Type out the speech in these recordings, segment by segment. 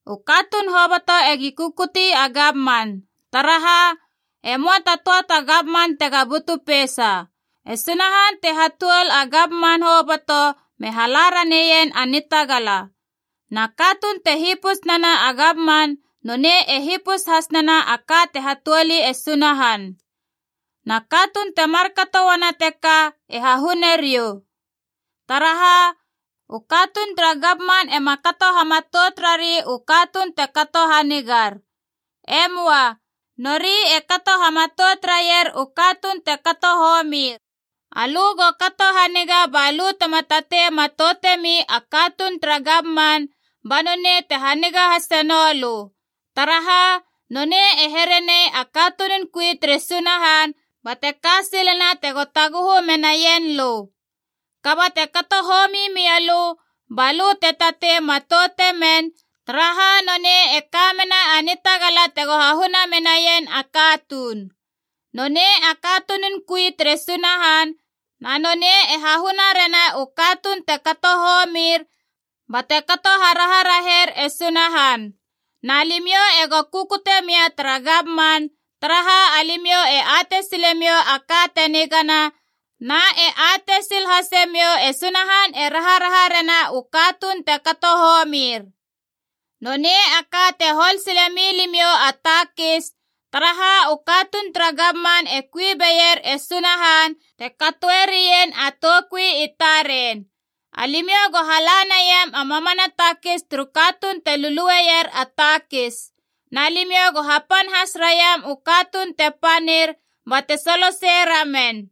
U katuun hoboto egi kukuti a gamman. Taraha, e möa ta töa ta gamman tega butu peisa. E Sunahan te hatuol a gamman hoboto me hala raneien a nitagala. Na katuun te hipus nena a gamman nonei e hipus has nena a ka te hatuoli e Sunahan. Na katuun te markato uana teka e hahune riou. Taraha, u katuun tara gamman ema kato hamatout rari u katuun te kato hanigar. E möa. Nori e kato hamatout raier u katuun te kato homir. Alö go kato haniga balö tema tatei matoutemi a katuun tara gamman, ba nonei te haniga hase noulö. Taraha, nonei e here nei a katunun kui tere Sunahan bate ka silena tego taguhu menaien lö. Kaba te kato homi mialö, balö te tatei matoute men, taraha nonei e ka mena a nitagala tego hahuna menaien a katuun. Nonei a katunun kui tere Sunahan na nonei e hahuna rena u katuun te kato homir bate kato haraharaher e Sunahan. Na limiou ego kukute mia tara gamman, taraha alimiou e atei silemiou a ka te nigana, na e atei sil hasemiou e Sunahan e raharaha rena u katuun te kato homir. Nonei a ka te hol sile milimiou a takis, taraha u katuun tara gamman e kui beier e Sunahan te katoe rien a toukui i taren. Alimiou go hala naiam a mamana takis turu katuun te lulueier a takis. Na limiou go hapan has raiam u katuun te panir bate solosei ramen.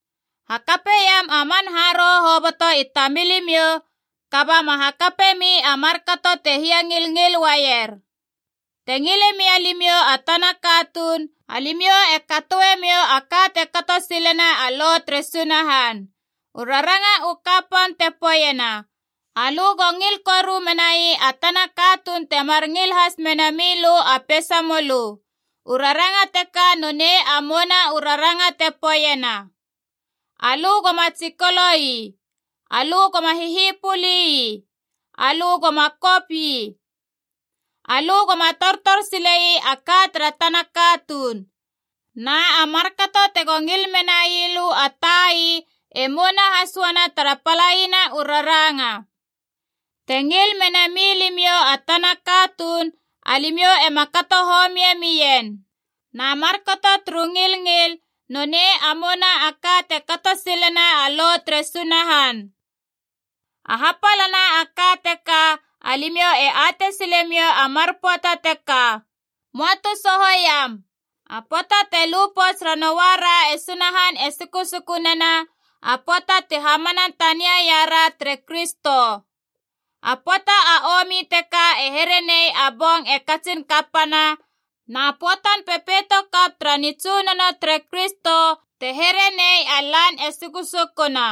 Hakapeiam a man haroho hoboto i tamilimiou, kaba ma hakapemi a markato te hiangilngil uaier. Te ngile mia limiou a tana katuun, alimiou e katoe miou a ka te kato silena a Lo tere Sunahan. U raranga u kapan te poeiena, “Alö go ngil koru menai a tana katuun temar ngil has mena milö a peisamölö.” U raranga teka nonei a mouna u raranga te poeiena, “Alö goma tsikolo ii. Alö goma hihipöli ii. Alö goma kop ii. Alö goma tortor sile ii a ka tara tana katuun.” Na a markato tego ngil menai lö a tai e mouna has uana tara palaina u raranga. Te ngil menami limiou a tana katuun, alimiou ema kato homie mien. Na markato turu ngilngil nonei a mouna a ka te kato silena a Lo tere Sunahan. A hapalana a ka teka, alimiou e atei silemiou a mar pöata teka. Möa tu sohoiam, a pöata te lu pouts ranoa ra e Sunahan e sukusuku nena a pöata ti hamana tania iara tere Kristo. A pöata a omi teka te here nei a bong e katsin kapana, na pöatan pepeito kap tara nitsunono tere Kristo te here nei a lan e sukusukuna.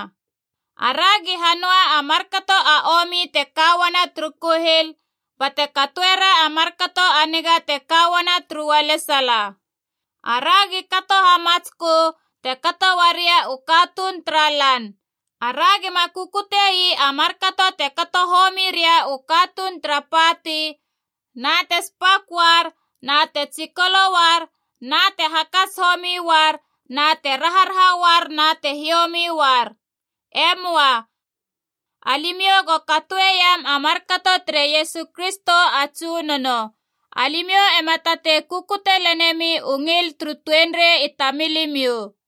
Aragi hanöa a markato a omi te ka uana turu kuhil bate katoera a markato a niga te ka uana turu ualesala. Aragi kato hamatskö, te kato uaria u katuun tara lan. Aragi ma kukutiei a markato te kato homi ria u katuun tara pati na te spak uar na te tsikolo uar na te hakats homi uar na te raharaha uar na te hiomi uar. E möa. Alimiou go katoeiam a markato tere Iesu Kristo a Tsunono. Alimiou ema tatei kukute lenemi u ngil turu tuenrei i tamilimiou.